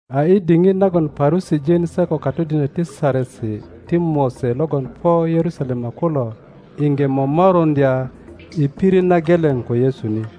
A i diŋit nagon Parusijin se kokatodinök ti Saresi ti Mose logon po Yerusalema kulo iŋge momoruŋdya i pirit na geleŋ ko Yesu ni,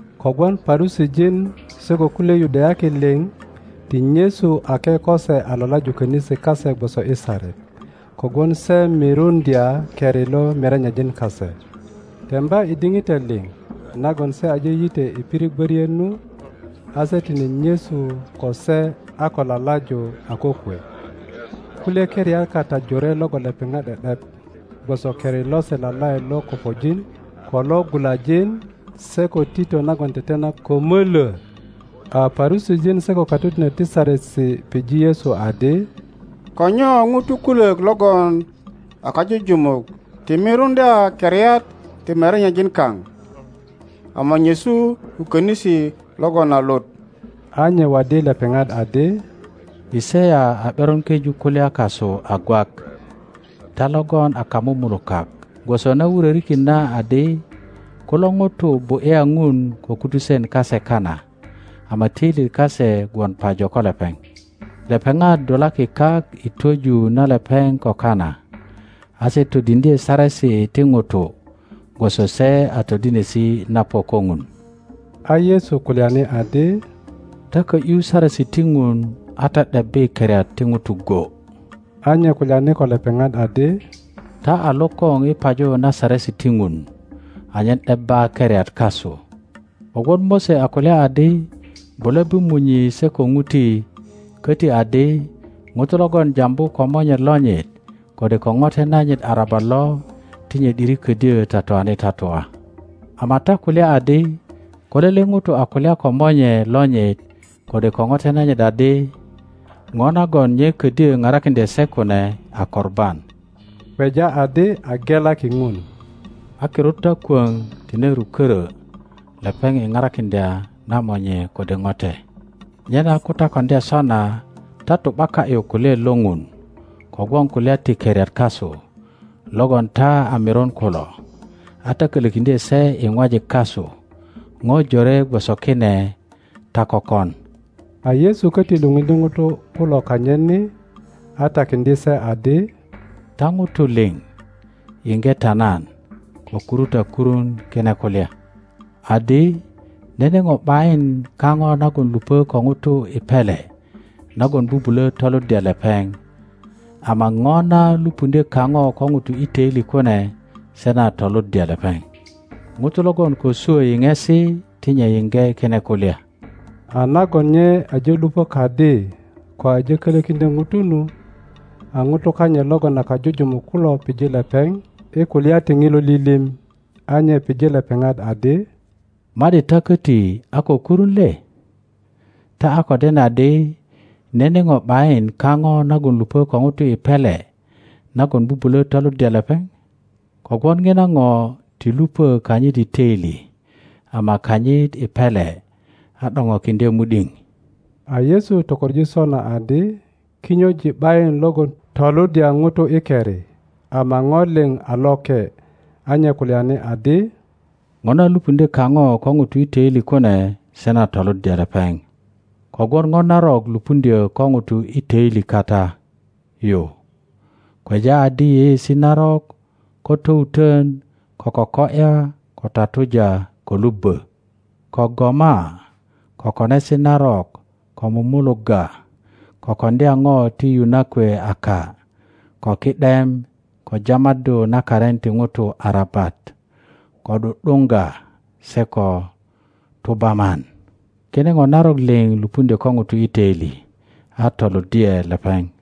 (Kogwon Parusijin se ko kulye Yudayaki liŋ ti nyesu ake ko se a lalaju könisi kase gwoso i saret, kogwon se miruŋdya keri lo merenyejin kase.) Temba i diŋitan liŋ nagon se aje yitwe i pirit gworiet nu, a se tine nyesu ko se a ko lalaju a kokwe. Kulye keriat kata jore logon lepeŋat ’de ’dep, gwoso keri lose lalaet lo kopojin, ko lo gulajin se ko tito nagon tetena ko mölwö. A Parusijin se ko katodinök ti Saresi pije Yesu adi, Ko nyo ŋutu kulök logon a kajujumuk ti miruŋdya keriat ti merenyejin kan, ama nyesu ko könisi logon a lut? A nye waddi lepeŋat adi, Yisaya a ’beron keju kulya kasu a gwak, ta logon a kamumulukak, gwoso na wurorikin na adi, Kulo ŋutu bu ’ya Ŋun ko kutusen kase kana, ama toilyet kase gwon pajo ko lepeŋ; lepeŋat dulaki kak i twöju na lepeŋ ko kana, a se todiŋdye saresi ti ŋutu gwoso se a todinesi na po ko Ŋun. A Yesu kulyani adi, Ta ko ’yu saresi ti ŋun a ta ’debbi keriat ti ŋutu go. A nye kulyani ko lepeŋat adi, Ta a lokoŋ i paju na saresi ti Ŋun anyen ’debba keriat kasu. Kogwon Mose a kulya adi, Bule bu munyi se ko ŋuti, koti adi, ŋuto logon jambu ko monye lonyit kode ko ŋote nanyit arabat lo, ti nye ’diri ködyö tatuani tatua. Ama ta kulya adi, Ko lele ŋuto a kulya ko monye lonyit kode ko ŋote nanyit adi, ŋo nagon nye ködyö parakiŋdye se kune a Korban (kweja adi a gelaki Ŋun), a kirut ta kwöŋ tine rukörö lepeŋ i parakiŋdya na monye kode ŋote. Nyena ko ta koŋdya sona, ta tu ’baka ’yu kulyaet lo ŋun kogwon kulya ti keriat kasu logon ta a mirun kulo, a ta kolökiŋdye se i ŋwajik kasu ŋo jore gwoso kine ta kökon. A Yesu koti lupundye ŋutu kulo kanyit ni a takiŋdye se adi, Ta ŋutu lio. yiŋge ta nan ko kuru ta kurun kine kulya, adi, nene ŋo ’bayin kaŋo nagon lupö ko ŋu i pele nagon bubulö toluddya lepeŋ, ama ŋo na lupuŋdyö kaŋo ko ŋuto i töili kune se na toluddya lepeŋ. [ŋuto logon ko swö yiŋesi ti nye yiŋge kine kulya.] A nagon nye aje lupö kadi ko aje kölökiŋdyo ŋutu nu, a ŋutu kanyit logon a kajujumuk kulo pije lepeŋ i kulya ti ŋilo lilim. A nye pije lepeŋat adi, Ma ’di ta köti a ko kurun le? Ta a ko den adi, nene ŋo ’bayin kaŋo nagon lupö ko ŋuto i pele nagon bubulö toluddya lepeŋ, kogwon ŋina ŋo ti lupö kanyit i töili ama kanyit i pele, a ’doŋokiŋdye mu ’diŋ. (A Yesu tokoŋ sona adi kinyojin ’bayin logon toluddya ŋutu i keri, ama ŋo lio a loke.) a nye kulyani adi, Ŋo na lupuŋdyö kaŋo ko ŋuto i toili kune se na toluddya lepeŋ. Kogwon ŋo narok lupuŋdyö ko ŋuto i töili kata yu, kweja adi yeyeesi narok, ko towutön, ko koko ’ya, ko tatuja, ko lubbo, ko goma, ko konesi narok, ko mumulugga, ko koŋdya ŋo ti yu na kwe aka, ko ki ’dem, ko jamaddu na karin ti ŋutu arabat, ko ’du ’duŋga, se ko tubaman. Kine po narok liŋ lupuŋdyö ko ŋuto i töili, a toluddye lepeŋ.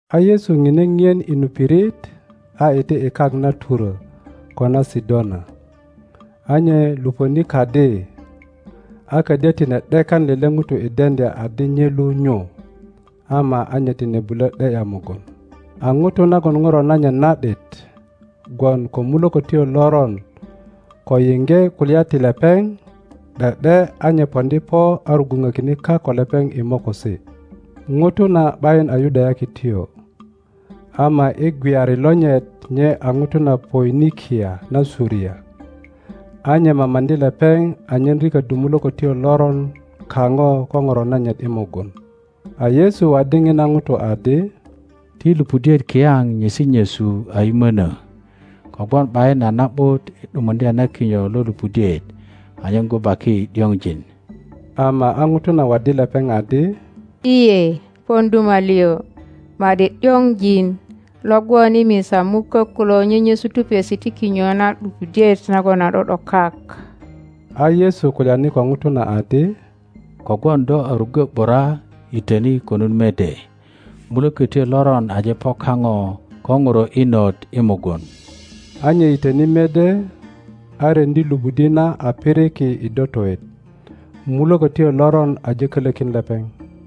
A Yesu ŋine ŋien i nu pirit a iti i kak na Turo ko na Sidona. A nye lupöni kadi, a ködyö tine ’dekan lele ŋuto i deŋdya adi nye lu nyu; ama a nye tine bulö ’de ’ya mugun. a ŋuto nagon ŋuro nanyit na ’dit gwon ko mulökotyo loron ko yiŋge kulya ti lepeŋ, ’de ’de a nye poŋdi po a rugwuŋökine kak ko lepeŋ i mokosi. ŋuto na ’bayin a Yudayakityo, ama i gweyari lonyit nye a ŋuto na Poinikia na Suria. A nye mamaŋdi lepeŋ anyen riköddu mulökotyo loron kaŋo ko ŋuro nanyit i mugun. A Yesu waddi ŋina ŋuto adi, Ti lupudiet kiyaŋ nyesi nyesu a yimönö; kogwon ’bayin a na ’but i ’dumuŋdya na kinyo lo lupudiet anyen gubaki ’diŋojin. Ama a ŋuto na waddi lepeŋ adi, lye, pon duma lio; ma ’di ’diŋojin lo gwon i misa mukök kulo nyenyesu tupesi ti kinyo na lupudiet nagon a ’do ’do kak. a Yesu kulyani ko ŋuto na adi, Kogwon do a ruggo ’bura yitöni konut mede; mulökötyo loron aje po kaŋo ko ŋuro inot i mugun. A nye yitöni mede, a ryeŋdi lupudi na a piriki i dotoet; mulökotyo loron aje kölökin lepeŋ.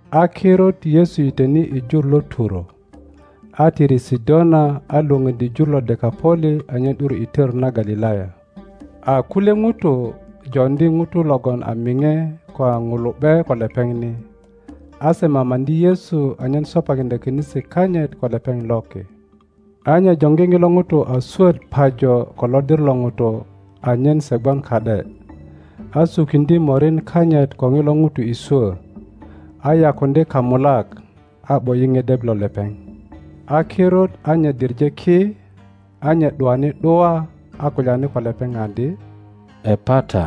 A kirut Yesu yitwene i jur lo Turo, a tiri Sidona a lwöŋoddi jur lo Dekaŋoli anyen ’dur i tör na Galilaya. A kulye ŋutu joŋdi ŋuto logon a miŋe ko a ŋulu ’be ko lepeŋ ni, a se mamaŋdi Yesu anyen sopakiŋdya könisi kanyit ko lepeŋ ki. A nye joŋgi ŋilo ŋuto a swöt pajo ko lodir lo ŋutu anyen se gwon ka ’de, a sukiŋdye morin kanyit ko ŋilo ŋuto i swö, a yakuŋdye kamulak, a ’bo ’yi ŋedep lo lepeŋ. a kirut a nye diŋe ki, a nye ’duani ’dua, a kulyani ko lepeŋ adi, Epata,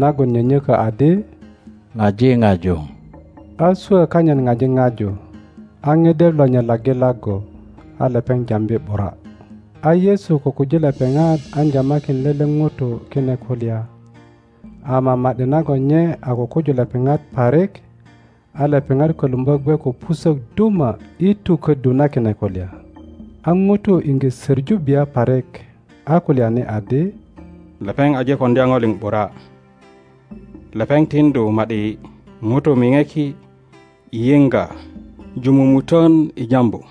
nagon nyönyokö adi, Ŋaji paju. a swö kanyit paji ŋaju, a ŋedep lonyit laggi laggu, a lepeŋ jambi ’bura. a Yesu kukuji lepeŋat an jamakin lele ŋuto kine kulya; ama ma ’di nagon nye a kukuju lepeŋat parik, a lepeŋat kölumbö gwe ko pusök duma i tuköddu na kine kulya. A ŋutu iŋge söŋu bia parik, a kulyani adi, Lepeŋ aje koŋdya ŋo liŋ ’bura; lepeŋ tiŋdu ma ’di ŋutu miŋeki i yiŋga ju mumutön i jambu.